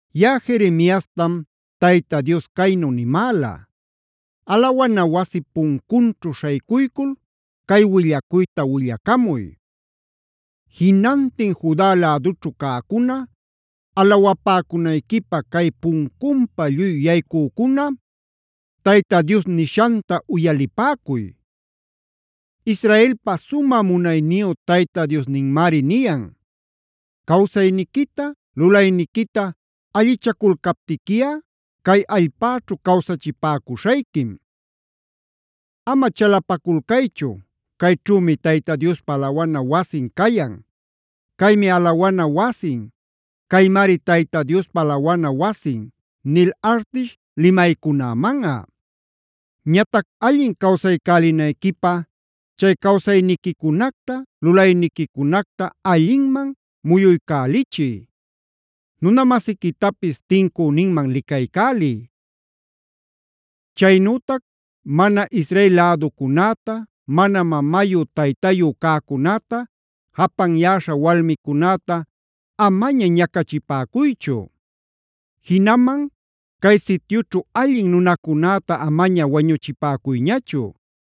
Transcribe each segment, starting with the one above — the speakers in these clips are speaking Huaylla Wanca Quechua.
Yaꞌa Jeremiastam Tayta Dios caynu nimäla: “Alawana wasip puncunćhu śhaycuycul cay willacuyta willacamuy: ‘Jinantin Juda lädućhu cäcuna, alawapäcunayquipä cay puncunpa lluy yaycücuna, Tayta Dios nishanta uyalipäcuy. Israelpa sumä munayniyu Tayta Diosninmari niyan: Cawsayniquita, lulayniquita allichaculcaptiquiꞌa cay allpäćhu cawsachipäcuśhayquim. Ama chalapaculcaychu: “Cayćhümi Tayta Diospa alawana wasin cayan. Caymi alawana wasin; caymari Tayta Diospa alawana wasin” nil artish limaycunämanꞌa. “ ‘Ñatac allin cawsaycälinayquipä chay cawsayniquicunacta, lulayniquicunacta allinman muyuycälichiy. Nuna-masiquitapis tincüninman licaycäliy. Chaynütac mana Israel läducunäta, mana mamayu taytayu cäcunäta, japanyäśha walmicunäta amaña ñacachipäcuychu. Jinaman cay sityućhu allin nunacunäta amaña wañuchipäcuyñachu.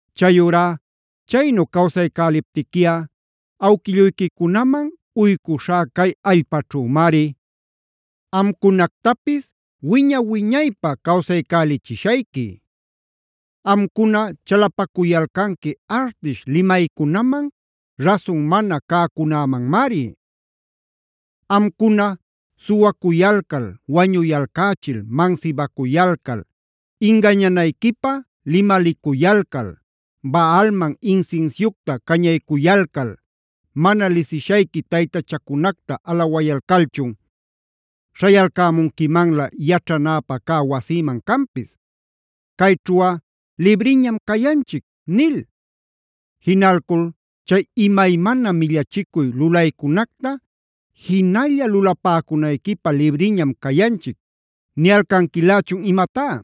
Chayurá chaynu cawsaycäliptiquiꞌa awquilluyquicunaman uycuśhá cay allpaćhümari amcunactapis wiña-wiñaypä cawsaycälichishayqui. “ ‘Amcuna chalapacuyalcanqui artish limaycunaman, rasun mana cäcunämanmari. Amcuna suwacuyalcal, wañuyalcächil, mansibacuyalcal, ingañanayquipä limalicuyalcal, Baalman insinsiucta cañaycuyalcal, mana lisishayqui taytachacunacta alawayalcalchun, ¿śhayalcämunquimanlä yaćhanäpä cä wasïman canpis “cayćhuꞌa libriñam cayanchic” nil? Jinalcul chay imaymana millachicuy lulaycunacta jinalla lulapäcunayquipä libriñam cayanchic ¿niyalcanquilächun imatá?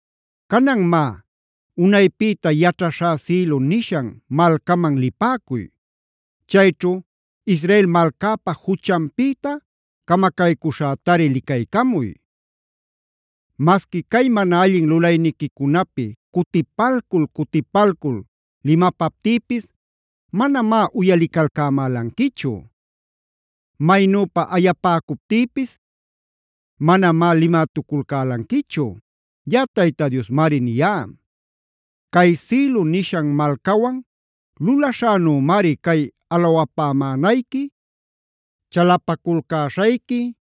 “ ‘Canan má, unaypïta yaćhaśhá Silo nishan malcaman lipäcuy. Chayćhu Israel malcäpa juchanpïta camacaycüśhätari licaycamuy. Masqui cay mana allin lulayniquicunapi cutipalcul-cutipalcul limapaptïpis manamá uyalicalcämälanquichu. Maynüpa ayapäcuptïpis manamá limalïtuculcälanquichu.b Yaꞌa Tayta Diosmari niyá. Cay Silo nishan malcawan lulaśhänümari, cay alawapämänayqui, chalapaculcäśhayqui,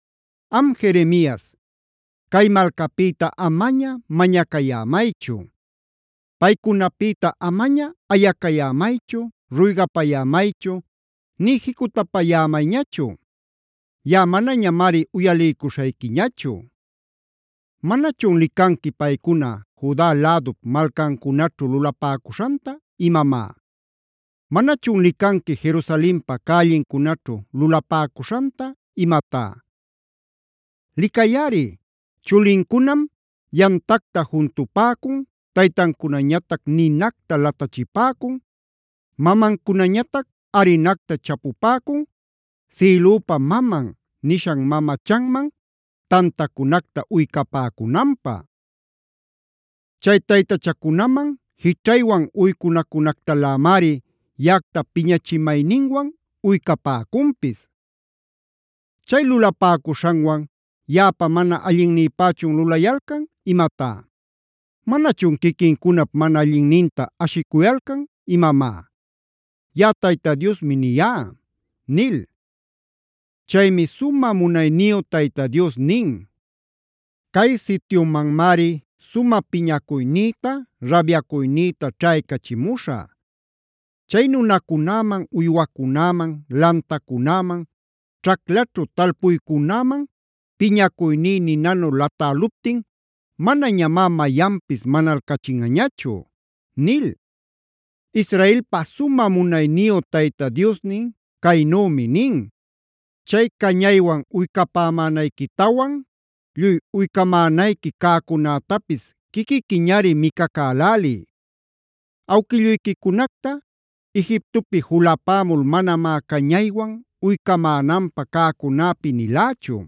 “Am Jeremias, cay malcapïta amaña mañacayämaychu. Paycunapïta amaña ayacayämaychu, ruygapayämaychu, nï jicutapayämayñachu. Yaꞌa manañamari uyaliycuśhayquiñachu. ¿Manachun licanqui paycuna Juda lädup malcancunaćhu lulapäcuśhanta imamá? ¿Manachun licanqui Jerusalenpa cällincunaćhu lulapäcuśhanta imatá? Licayꞌari, chulincunam yamtacta juntupäcun; taytancunañatac ninacta latachipäcun; mamancunañatac arinacta chapupäcund ‘Sïlüpa Maman’e nishan mamachanman tantacunacta uycapäcunanpä. Chay taytachacunaman jićhaywan uycunacunactalämari yaꞌacta piñachimayninwan uycapäcunpis. Chay lulapäcuśhanwan ¿yaꞌapa mana allinnïpächun lulayalcan imatá? ¿Manachun quiquincunap mana allinninta ashicuyalcan imamá? Yaꞌa Tayta Diosmi niyá” nil. Chaymi sumä munayniyu Tayta Dios nin: “Cay sityumanmari sumä piñacuynïta, rabyacuynïta ćhaycachimuśhä. Chay nunacunäman, uywacunäman, lantacunäman, ćhaclaćhu talpuycunäman piñacuyní ninanu latäluptin, manañamá mayanpis manalcachinꞌañachu” nil. Israelpa sumä munayniyu Tayta Diosnin caynümi nin: “Chay cañaywan uycapämänayquitawan, lluy uycamänayqui cäcunätapis quiquiquiñari micacäläliy. Awquilluyquicunacta Egiptopi julapämul manamá cañaywan uycamänanpä cäcunäpi nilächu.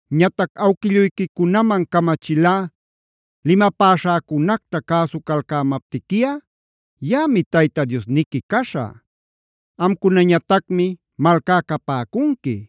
Ñatac awquilluyquicunaman camachilá: ‘Limapäśhäcunacta cäsucalcämaptiquiꞌa yaꞌami Tayta Diosniqui caśhä. Amcunañatacmi malcá capäcunqui.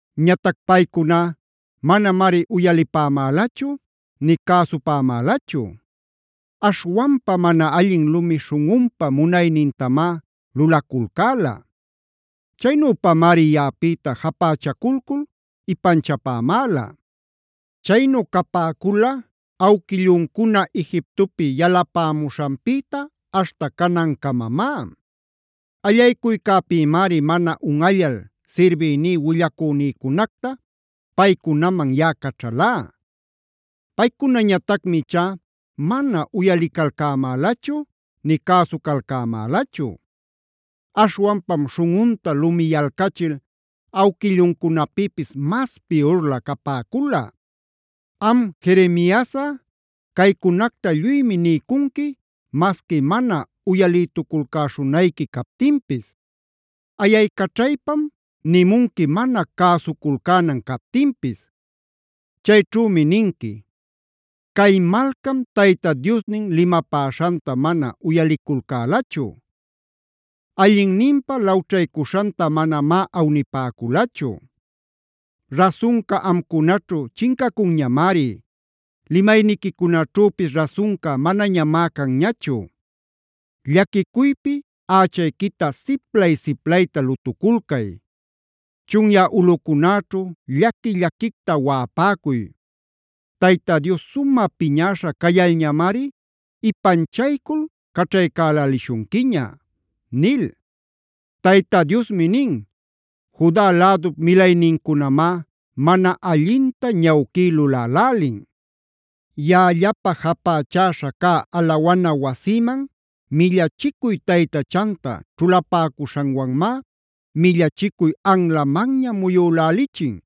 “Ñatac paycuná manamari uyalipämälachu nï cäsupämälachu. Aśhwanpa mana allin lumi śhunꞌunpa munaynintamá lulaculcäla. Chaynüpamari yaꞌapïta japächaculcul ipanchapämäla. Chaynu capäcula awquilluncuna Egiptopi yalapämuśhanpïta aśhta canancamamá. Allaycuycäpïmari mana unꞌallal sirbïní willacünïcunacta paycunaman yaꞌa caćhalá. Paycunañatacmi ichá mana uyalicalcämälachu nï cäsucalcämälachu. Aśhwanpam śhunꞌunta lumiyalcachil awquilluncunapïpis mas piyurlä capäcula. “Am Jeremiasꞌa caycunacta lluymi niycunqui masqui mana uyalïtuculcäśhunayqui captinpis. Ayaycaćhaypam nimunqui mana cäsuculcänan captinpis. Chayćhümi ninqui: ‘Cay malcam Tayta Diosnin limapäśhanta mana uyaliculcälachu; allinninpä lawćhaycuśhanta manamá awnipäculachu. Rasunca amcunaćhu chincacunñamari. Limayniquicunaćhüpis rasunca manañamá canñachu. Llaquicuypi ächayquita siplay-siplayta lutuculcay. Chunyä ulꞌucunäćhu llaqui-llaquicta waꞌapäcuy. Tayta Dios sumä piñäśha cayalñamari ipanchaycul caćhaycälälishunquiña’” nil. Tayta Diosmi nin: “Juda lädup milaynincunamá mana allinta ñawquí lulälälin. Yaꞌallapä japächäśha cä alawana wasïman millachicuy taytachanta ćhulapäcuśhanwanmá millachicuy anlamanña muyülälichin.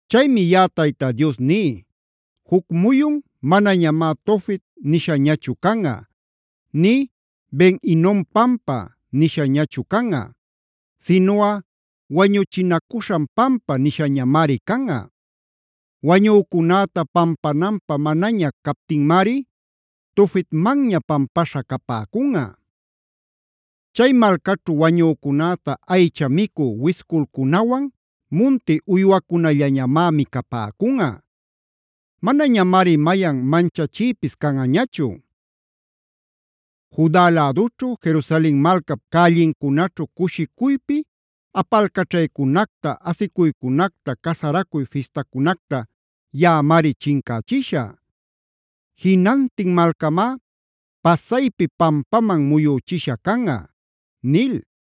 Chaymi yaꞌa Tayta Dios ní: Juc muyun manañamá ‘Tofet’ nishañachu canꞌa, nï ‘Ben-hinom pampa’ nishañachu canꞌa, sinuꞌa ‘Wañuchinacuśhan pampa’ nishañamari canꞌa.k Wañücunäta pampananpä manaña captinmari Tofetmanña pampaśha capäcunꞌa. Chay malcaćhu wañücunäta aycha micü wisculcunawan munti uywacunallañamá micapäcunꞌa. Manañamari mayan manchachïpis canꞌañachu. Juda lädućhu, Jerusalen malcap cällincunaćhu cushicuypi apalcaćhaycunacta, asicuycunacta, casaracuy fistacunacta yaꞌamari chincächishä.l Jinantin malcamá pasaypi pampaman muyüchisha canꞌa” nil.